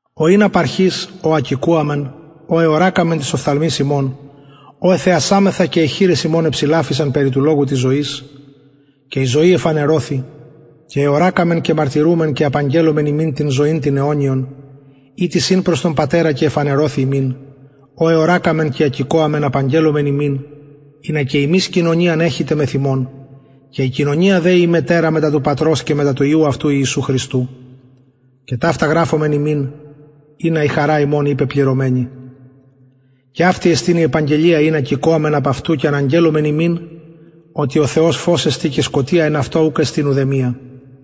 ο ην απ αρχης ο ακηκοαμεν ο εωρακαμεν τοις οφθαλμοις ημων ο εθεασαμεθα και αι χειρες ημων εψηλαφησαν περι του λογου της ζωης και η ζωη εφανερωθη και εωρακαμεν και μαρτυρουμεν και απαγγελλομεν υμιν την ζωην την αιωνιον ητις ην προς τον πατερα και εφανερωθη ημιν ο εωρακαμεν και ακηκοαμεν απαγγελλομεν υμιν ινα και υμεις κοινωνιαν εχητε μεθ ημων και η κοινωνια δε η ημετερα μετα του πατρος και μετα του υιου αυτου ιησου χριστου και ταυτα γραφομεν υμιν ινα η χαρα ημων η πεπληρωμενη και εστιν αυτη η αγγελια ην ακηκοαμεν απ αυτου και αναγγελλομεν υμιν οτι ο θεος φως εστιν και σκοτια εν αυτω ουκ εστιν ουδεμια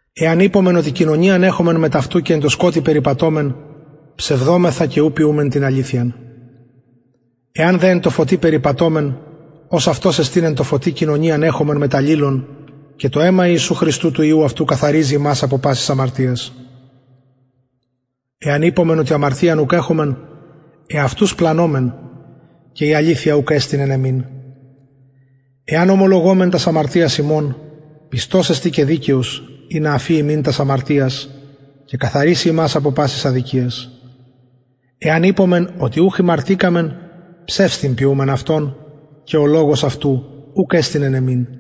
εαν ειπωμεν οτι κοινωνιαν εχομεν μετ αυτου και εν τω σκοτει περιπατωμεν ψευδομεθα και ου ποιουμεν την αληθειαν εαν δε εν τω φωτι περιπατωμεν ως αυτος εστιν εν τω φωτι κοινωνιαν εχομεν μετ αλληλων και το αιμα ιησου χριστου του υιου αυτου καθαριζει ημας απο πασης αμαρτιας εαν ειπωμεν οτι αμαρτιαν ουκ εχομεν εαυτους πλανωμεν και η αληθεια ουκ εστιν εν ημιν εαν ομολογωμεν τας αμαρτιας ημων πιστος εστιν και δικαιος ινα αφη ημιν τας αμαρτιας και καθαριση ημας απο πασης αδικιας εαν ειπωμεν οτι ουχ ημαρτηκαμεν ψευστην ποιουμεν αυτον και ο λογος αυτου ουκ εστιν εν ημιν